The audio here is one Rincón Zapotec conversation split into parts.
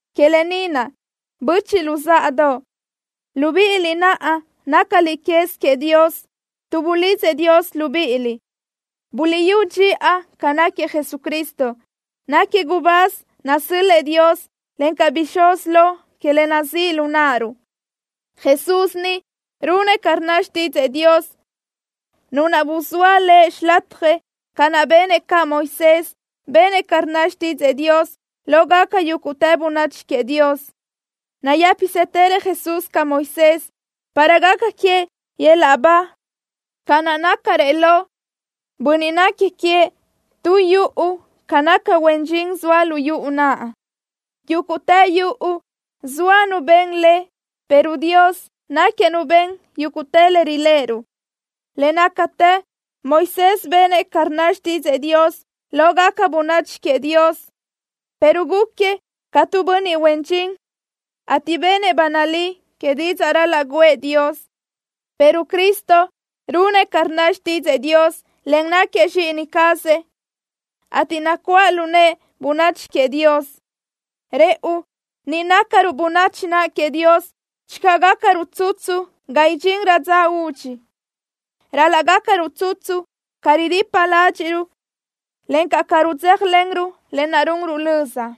Que lë ni naʼ, böchiʼ luzáʼadoʼ, libíʼiliʼ naʼ nácaliʼ quez queëʼ Dios tuʼ bulidzëʼ Dios libíʼiliʼ, buliʼyú dxiʼa ca náquiëʼ Jesucristo. Náquiëʼ gubáz nasö́l-lëʼë Dios, encaʼ bixúz lo que le nazíʼ lu náʼaruʼ. Jesús ni runëʼ ca rnna xtídzëʼë Dios, Nu naʼ buzóa Lëʼ xilatjëʼ, ca naʼ benëʼ caʼ Moisés, benëʼ ca rnna xtídzëʼë Dios lógaca yúguʼtë bönachi queëʼ Dios. Nayë́pisëtërëʼ Jesús ca Moisés, para gaca queëʼ yöl-laʼ ba, ca naʼ nácarëʼ lo bönniʼ nequi queëʼ tu yuʼu ca naca huen dxin zoëʼ lu yuʼu naʼ. Yúguʼtë yuʼu, zoa nu ben le, pero Dios náquiëʼ Nu ben yúguʼtë le riléʼeruʼ. Le nácatë Moisés benëʼ ca rnna xtídzëʼë Dios lógaca bönachi queëʼ Dios, pero gúquiëʼ ca tu bönniʼ huen dxin, ateʼ benëʼ ba nalí que didzaʼ ral-laʼ guʼë Dios, pero Cristo runëʼ ca rnna xtídzëʼë Dios, en náquiëʼ Zxíʼini cazëʼ, ateʼ nacuáʼ lu nëʼë bönachi queëʼ Dios. Rëʼu ni, nácaruʼ bönachi naʼ queëʼ Dios channö gácaruʼ tsutsu ga idxinrö dza údxi. Ral-laʼ gácaruʼ tsutsu ca ridipa ládxiʼruʼ, encaʼ ca rudzéjalenruʼ lë naʼ runruʼ löza.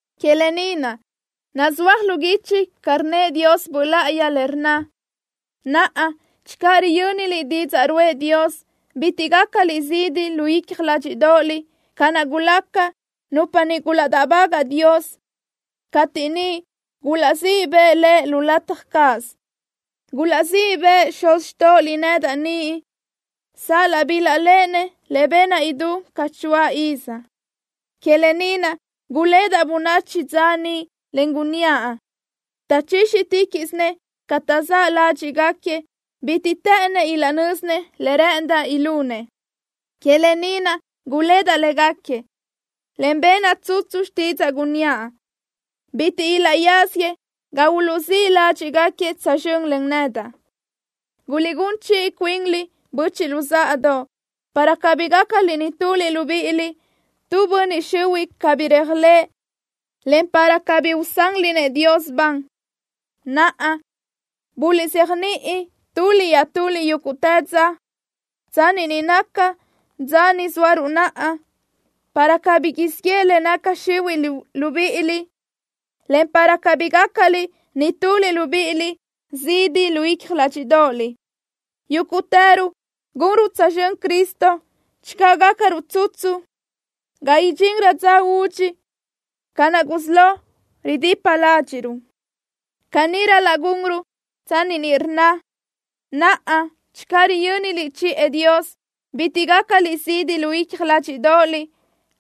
Que lë ni naʼ, nazúaj lu guichi ca rnnëʼ Dios Böʼ Láʼayi le rnna: Naʼa, channö riyö́niliʼ didzaʼ ruʼë Dios, bitiʼ gácaliʼ zidi lu icja ládxiʼdoʼoliʼ ca naʼ gulaca nupa niʼ gulaʼdáʼbagaʼ Dios cateʼ niʼ gulaʼzíʼ bëʼ Lëʼ lu lataj cáʼasö. Gulaʼzíʼ bëʼë xuz xtóʼoliʼ nedaʼ niʼ sal-laʼ bilaʼléʼenëʼ le benaʼ idú ca choáʼ iz. Que lë ni naʼ gulédaʼ bönachi dza niʼ, en gunníaʼ: “Taʼchíxiticaʼsinëʼ ca taʼzáʼ ládxiʼgaquiëʼ. Bitiʼ të́ʼënnëʼ ilaʼnö́zinëʼ le rë́ʼëndaʼ ilunëʼ.” Que lë ni naʼ gulédaʼ légaquiëʼ, en benaʼ tsutsu xtídzaʼa, gunníaʼ: “Bitiʼ ilaʼyáziëʼ ga uluʼzíʼ ládxiʼgaquiëʼ tsözxö́n len nedaʼ.” Guliʼgún chiʼi cuinliʼ, böchiʼ luzáʼadoʼ, para cabí gácaliʼ nituliʼ libíʼiliʼ tu bönniʼ xihuiʼ cabí réajlëʼë, en para cabí usanliʼ-nëʼ Dios ban. Naʼa, buliʼzéajniʼi tuliʼ iaʼtuliʼ yúguʼtë dza, tsanni ni naca dza ni zóaruʼ naʼa, para cabí siʼ yeʼe le naca xihuiʼ libíʼiliʼ, en para cabí gácaliʼ nituliʼ libíʼiliʼ zidi lu icja ládxiʼdoʼoliʼ. Yúguʼtëruʼ gunruʼ tsözxö́n Cristo channö gácaruʼ tsutsu ga idxinrö dza údxi, ca naʼ gusí lo ridipa ládxiʼruʼ. Caní ral-laʼ gunruʼ tsanni ni rnna: Naʼa, channö riyö́niliʼ chiʼë Dios, bitiʼ gácaliʼ zidi lu icja ládxiʼdoʼoliʼ,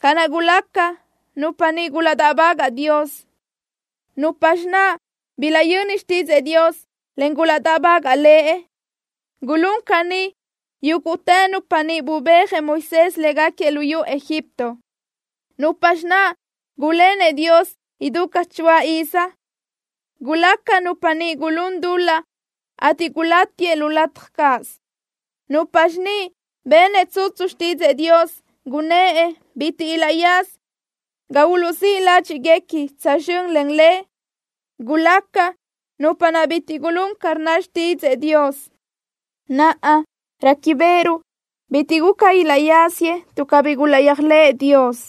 ca naʼ gulaca nupa niʼ gulaʼdáʼbagaʼ Dios. ¿Nupxi naʼ bilaʼyöni xtídzëʼë Dios, en gulaʼdáʼbagaʼ Lëʼ? Gulún caní yúguʼtë nupa niʼ bubéajëʼ Moisés léguequi luyú Egipto. ¿Nupxi naʼ gulénëʼ Dios idú ca choáʼ iz? Gulaca nupa niʼ gulún dul-laʼ, ateʼ gulati lu lataj cáʼasö. ¿Nupxi niʼ benëʼ tsutsu xtídzëʼë Dios, gunnë́ʼ bitiʼ ilaʼyaza ga uluʼzíʼ ládxiʼguequi tsözxö́n len Lëʼ? Gulaca nupa niʼ bitiʼ gulún ca rnna xtídzëʼë Dios. Naʼa, réquibeʼeruʼ bitiʼ guca ilaʼyáziëʼ tuʼ cabí gulaʼyéajlëʼë Dios.